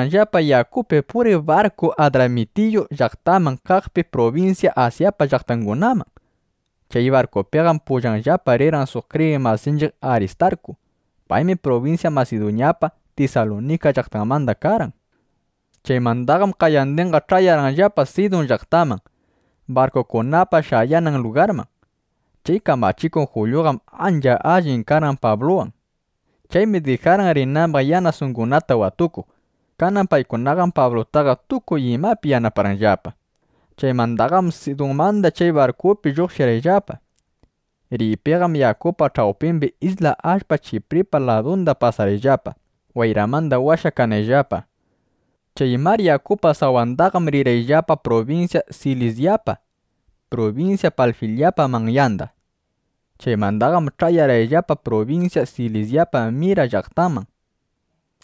Rirqayllapa yakupi puriq barku Adramitiyu llaqtamanda kaqpi prubinsya Asyapa llaqtangunaman. Chay barkupiqam pullayllapa rirqan kriyiq masinchiq Aristarku. Paymi prubinsya Masiduñapa Tisalunika llaqtanmanda karqan. Chaymandaqam qayandinqa ch'ayarqayllapa Sidun llaqtaman, barkukunapa shayanan lugarman. Chay kamachikuq Julyuqam ancha alli karqan Pabluwan. Chaymi dijarqan rinambaq yanasungunata (yanasangunata) watukuq. Kanan paykunaqam Pablutaqa tukuy imapi yanaparqanllapa. Chaymandaqam Sidunmanda chay barkupina lluqshirqayllapa. Riypiqam yakupa ch'awpimbi isla allpa Chipripa ladunda pasarqayllapa, wayramanda washakanayllapa. Chay mar yakupa sawandaqam rirqayllapa prubinsya Silisyapa, prubinsya Panfilyapa manyanda. Chaymandaqam ch'ayarqayllapa prubinsya Lisyapa Mira llaqtanman.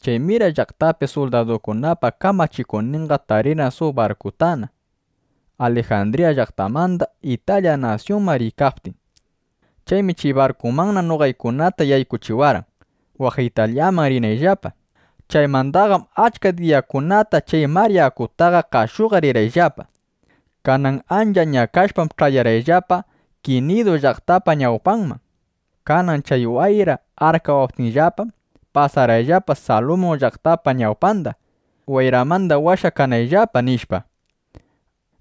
Chay Mira llaqtapi suldadukunapa kamachikuqninqa tarirqan suq barkutana, Alijandriya llaqtamanda Italya nasyunman riykaptin. Chaymi chay barkumanna noqaykunata yaykuchiwarqan, waq Italyamanna rinayllapa. Chaymandaqam achka diyakunata chay mar yakutaqa qashuqa rirqayllapa. Kanan ancha ñakashpam ch'ayarqayllapa Kinidu llaqtapa ñawpanman. Kanan chay wayra arkawaptinllapam, pasarqayllapa Salmun llaqtapa ñawpanda. Wayramanda washakanayllapa, nishpa,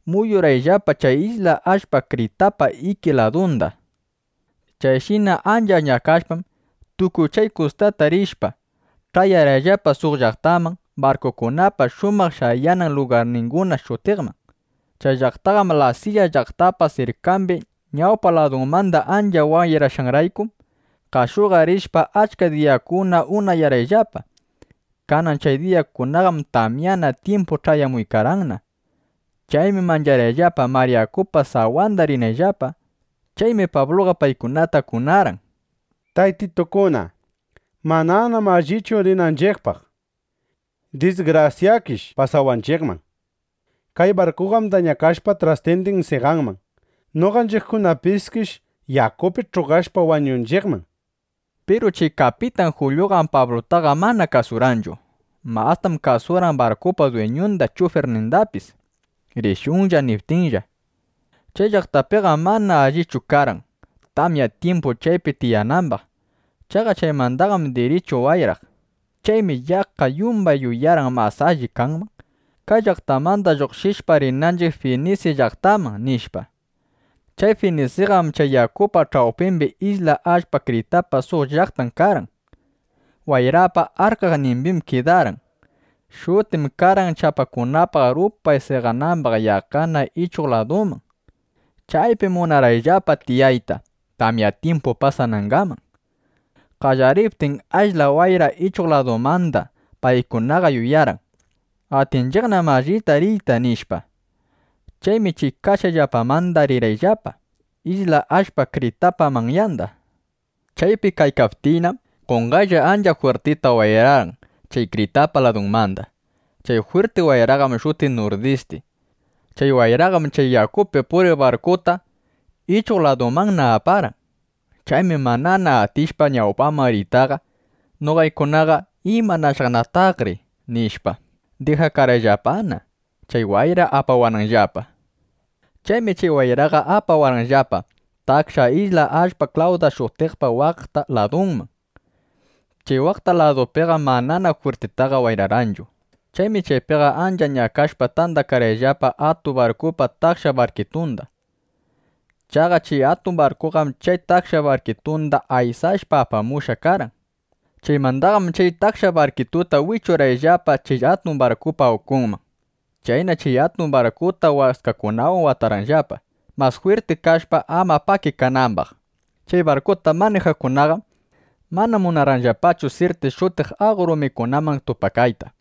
muyurqayllapa chay isla allpa Kritapa iki ladunda. Chayshina ancha ñakashpam, tukuy chay kustata rishpa, ch'ayarqayllapa suq llaqtaman “Barkukunapa shumaq shayanan lugarninguna” shutiqman. Chay llaqtaqam Lasiya llaqtapa sirkambi. Ñawpa ladumanda ancha wayrashqanraykum, qashuqa rishpa, achka diyakunata unayarqayllapa. Kanan chay diyakunaqam tamyanan tyimpu ch'ayamuykarqanna. Chaymi mancharqayllapa mar yakupa sawanda rinayllapa. Chaymi Pabluqa paykunata kunarqan: —Taytitukuna, mananam allichu rinanchiqpaq. Disgrasyakish pasawanchiqman. Kay barkuqam dañakashpa trastindin seqanman. Noqanchiqkunapiskish yakupi ch'uqashpa, wañunchiqman, nishpa. Piru chay kapitan Julyuqam Pablutaqa mana kasurqanchu. Mastam kasurqan barkupa dwiñunda chufirnindapis, “Rishunlla”, niptinllapa. Chay llaqtapiqam mana allichu karqan, tamya tyimpu chaypi tiyanambaq. (Chaqa chaymanqam dirichu wayraq.) Chaymi yaqqa yumbay yuyarqan: Mas alli kanman, kay llaqtamanda lluqshishpa, rinanchiq Finisi llaqtaman, nishpa. Chay Finisiqam chay yakupa ch'awpimbi isla allpa Kritapa suq llaqtan karqan. Wayrapa arkaqnimbim kidarqan. Shutim karqan chapakunapaq rupay seqanamba yaqqa ichuq ladunman. Chaypim munarqanllapa tiyayta, tamya tyimpu pasanangaman. Qallariptin ashla wayra ichuq ladumandam, paykunaqa yuyarqan: Atinchiqnam allita riyta, nishpa. Chaymi chay kashqayllapamanda rirqayllapa isla allpa Kritapa manyanda. Chaypi kaykaptiynam, qonqaylla das ancha jwirtita wayrarqan chay Kritapa ladunmanda. Chay jwirti wayraqam shutiq “Nurdisti”. Chay wayraqam chay yakupi puriq barkuta ichuq ladumanna aparqan. Chaymi manana atishpa ñawpaman riytaqa, noqaykunaqa ¿imanashaqnataqri? nishpa, dijakarqayllapana, chay wayra apawananllapa. Chaymi chay wayraqa apawarqanllapa taksha isla allpa Klawda shutiqpa waqta ladunman. Chay waqta ladumbiqam manana jwirtitaqa wayrarqanchu. Chaymi chaypiqa ancha ñakashpa, tandarqayllapa atun barkupa taksha barkitunda. Chaqa chay atun barkuqam chay taksha barkitunda aysashpa apamushqa karqan. Chaymandaqam chay taksha barkituta wichurqayllapa chay atun barkupa ukunman. Chaynam chay atun barkuta waskakunawan watarqayllapa, mas jwirti kashpa, ama pakikanambaq. Chay barkuta manijaqkunaqam mana munarqanllapachu Sirti shutiq aqo rumikunaman tupakayta.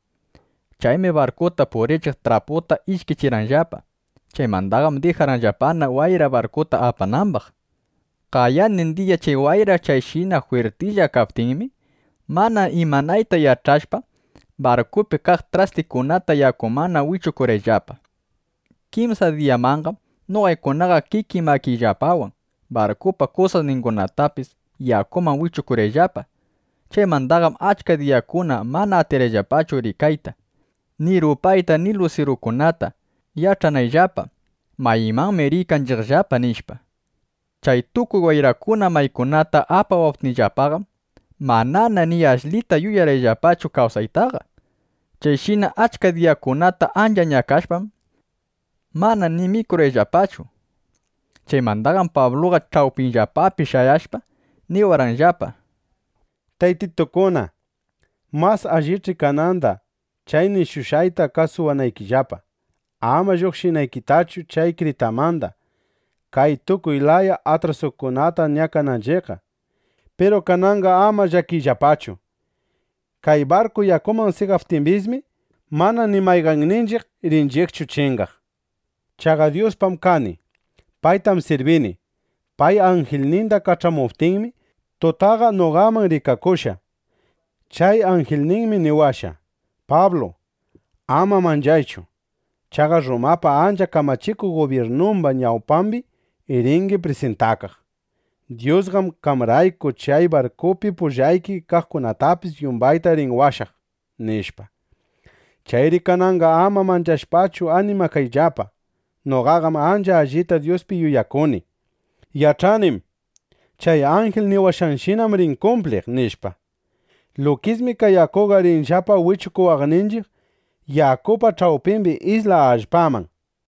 Chaymi barkuta purichiq traputa ishkichirqanllapa. Chaymandaqam dijarqanllapana, wayra barkuta apanambaq. Qayandin diya chay wayra chayshina jwirtilla kaptinmi, mana imanayta yach'ashpa, barkupi kaq trastikunata yakumanna wichukurqanllapa. Kimsa diyamanqam noqaykunaqa kikiy makiyllapawan, barkupa kusasningunatapis yakuman wichukurqayllapa. Chaymandaqam achka diyakunata mana atirqayllapachu rikayta ni rupayta ni lusirukunata, yach'anayllapa: Maymanmi riykanchiqllapa, nishpa. Chay tukuy wayrakuna maykunata apawaptinllapaqam, manana ni ashlita yuyarqayllapachu kawsaytaqa. Chayshina achka diyakunata ancha ñakashpam, mana ni mikurqayllapachu. Chaymandaqam Pabluqa ch'awpiyllapapi shayashpa, niwarqanllapa: —Taytitukuna, mas allich'i kananda chay nishushqayta kasuwanaykillapa. Ama lluqshinanchiqtachu chay Kritamanda, kay tukuy laya atrasukunata ñakananchiqqa. Piru kananqa ama llakiyllapachu. Kay barku yakuman seqaptimbismi, mana ni mayqanninchiq rinchiqchu chingaq. Chaqa Dyuspam kani. Paytam sirbini. Pay anjilninda kach'amuptinmi, tutaqa noqaman rikakushqa. Chay anjilninmi niwashqa: “Pablu, ama manchaychu. Chaqa Rrumapa ancha kamachikuq gubyirnumba ñawpambi ringi prisintakaq. Dyusqam qamrayku chay barkupi pullayki kaqkunatapis yumbayta rin washaq”, nishpa. Chayri kananqa ama manchashpachu animakayllapa. Noqaqam ancha allita Dyuspi yuyakuni. Yach'anim: Chay anjil niwashqanshinam rin kumpliq, nishpa. Lukismi kay yakukunaqa rinllapa wichukuwaqninchiq yakupa ch'awpimbi isla allpaman.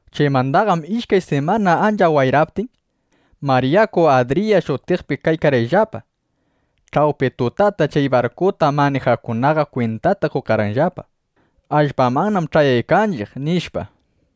Chaymandaqam ishkay simanata ancha wayraptin, mar yaku Adriya shutiqpi kaykarqayllapa. Ch'awpi tutata chay barkuta manijaqkunaqa kwintata qokarqanllapa: Allpamannam ch'ayaykanchiq, nishpa.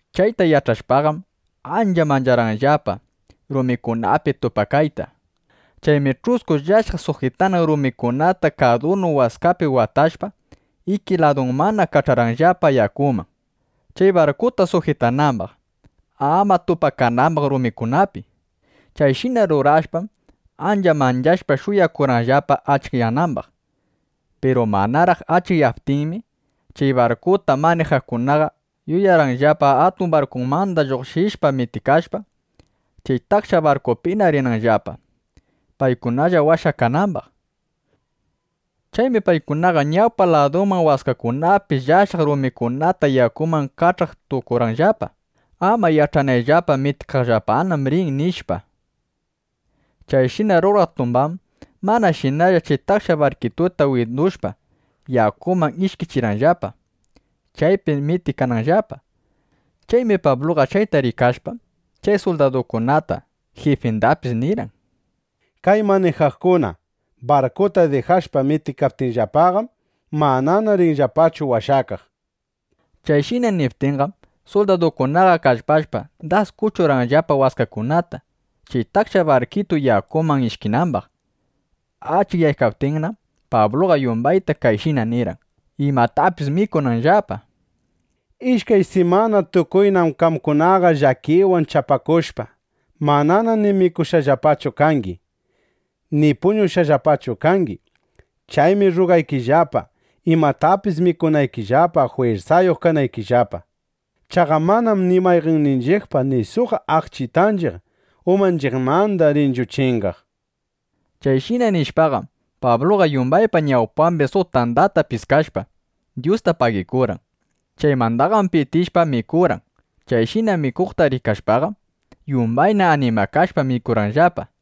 Chayta yach'ashpaqam, ancha mancharqanllapa rumikunapi tupakayta. Chaymi ch'usku llashaq sujitanan rumikunata kadunu waskapi watashpa, iki ladumanda kach'arqanllapa yakuman, chay barkuta sujitanambaq, ama tupakanambaq rumikunapi. Chayshina rurashpam, ancha manchashpa, shuyakurqanllapa achikyanambaq. Piru manaraq achikyaptinmi, chay barkuta manijaqkunaqa yuyarqanllapa atun barkumanda lluqshishpa, mitikashpa, chay taksha barkitupina rinanllapa, paykunalla washakanambaq. Chaymi paykunaqa ñawpa ladumanda waskakunapi llashaq rumikunata yakuman kach'aq tukurqanllapa, ama yach'anayllapa: Mitikaqllapanam rin, nishpa. Chayshina ruraq tumbam manashinalla chay taksha barkituta windushpa, yakuman ishkichiykarqanllapa, chaypi mitikananllapa. Chaymi Pabluqa chayta rikashpa, chay suldadukunata, jifindapis nirqan: —Kay manijaqkuna barkuta dijashpa mitikaptinllapaqam, manana ringillapachu washakaq, nishpa. Chayshina niptinqam, suldadukunaqa kallpashpa, das kuchurqanllapa waskakunata, chay taksha barkitu yakuman ishkinambaq. Achikyaykaptinnam Pabluqa yumbayta kayshina nirqan, imatapis mikunanllapa: —Ishkay simana tukuynam qamkunaqa llakiwan chapakushpa, mana ni mikushqallapachu kangi ˻ni puñushqallapachu kangi˼. Chaymi rrugaykillapa, imatapis mikunaykillapa, jwirsayuq kanaykillapa. Chaqa manam ni mayqanninchiqpa ni suq aqchitanchiq umanchiqmanda rinchu chingaq. Chayshina nishpaqam, Pabluqa yumbaypa ñawpambi suq tandata piskashpa, Dyusta pagikurqan. Chaymandaqam pitishpa, mikurqan. Chayshina mikuqta rikashpaqam, yumbayna animakashpa, mikurqayllapa.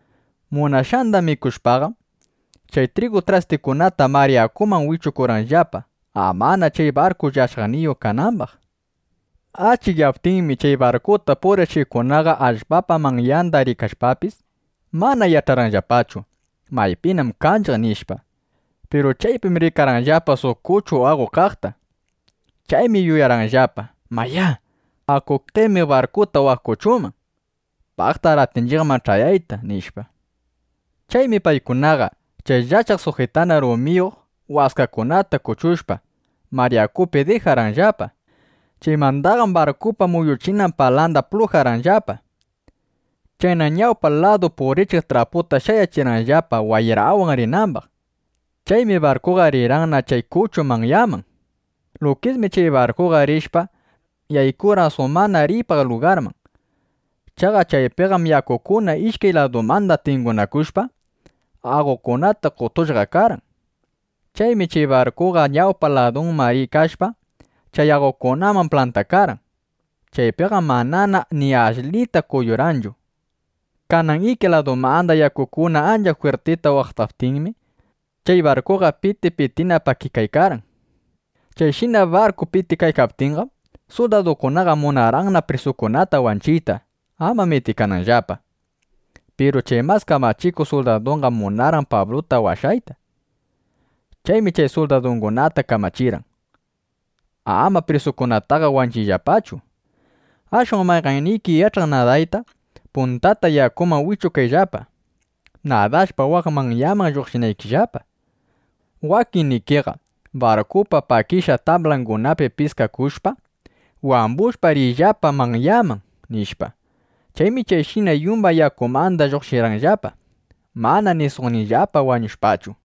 Munashqanda mikushpaqam, chay trigu trastikunata mar yakuman wichukurqanllapa, amana chay barku llashaqniyuq kanambaq. Achikyaptinmi, chay barkuta purichiqkunaqa allpapa manyanda rikashpapis, mana yach'arqanllapachu: Maypinam kanchiq, nishpa. Piru chaypim rikarqanllapa suq kuchu aqolla kaqta. Chaymi yuyarqanllapa: Mayá, aku qemiq barkuta waq kuchuman. Paqtar atinchiqman ch'ayayta, nishpa. Chaymi paykunaqa chay llashaq sujitanan rumiyuq waskakunata kuchushpa, mar yakupi dijarqanllapa. Chaymandaqam barkupa muyuchinan pala plujarqanllapa. Chayna ñawpa ladu purichiq traputa shayachirqanllapa, wayrawan rinambaq. Chaymi barkuqa riykarqanna chay kuchu manyanman. Lukismi chay barkuqa rishpa, yaykurqan suq mana riypaq lugarman. Chaqa chaypiqam yakukuna ishkay ladumanda tingunakushpa, aqokunata qotushqa karqan. Chaymi chay barkuqa ñawpa ladunman riykashpa, chay aqokunaman plantakarqan. Chaypiqam manana ni ashlita kuyurqanchu. Kanan iki ladumanda yakukuna ancha jwirtita waqtaptinmi, chay barkuqa piti pitina pakikaykarqan. Chayshina barku pakikaykaptinqam, suldadukunaqa munarqanna prisukunata wanchiyta, ama mitikananllapa. Piru chay mas kamachikuq suldaduqam munarqan Pabluta washayta. Chaymi chay suldadungunata kamachirqan: —Ama prisukunataqa wanchiyllapachu. Ashwan mayqanniki yach'aq nadayta, puntata yakuman wikapakayllapa, nadashpa waq manyanman lluqshinaykillapa. Wakinnikiqa barkupa pakishqa tablangunapi piskakushpa, wambushpa, riyllapa manyaman, nishpa. Chaymi chayshina yumbay yakumandaqa lluqshirqayllapa, mana ni suqniyllapa wañushpachu.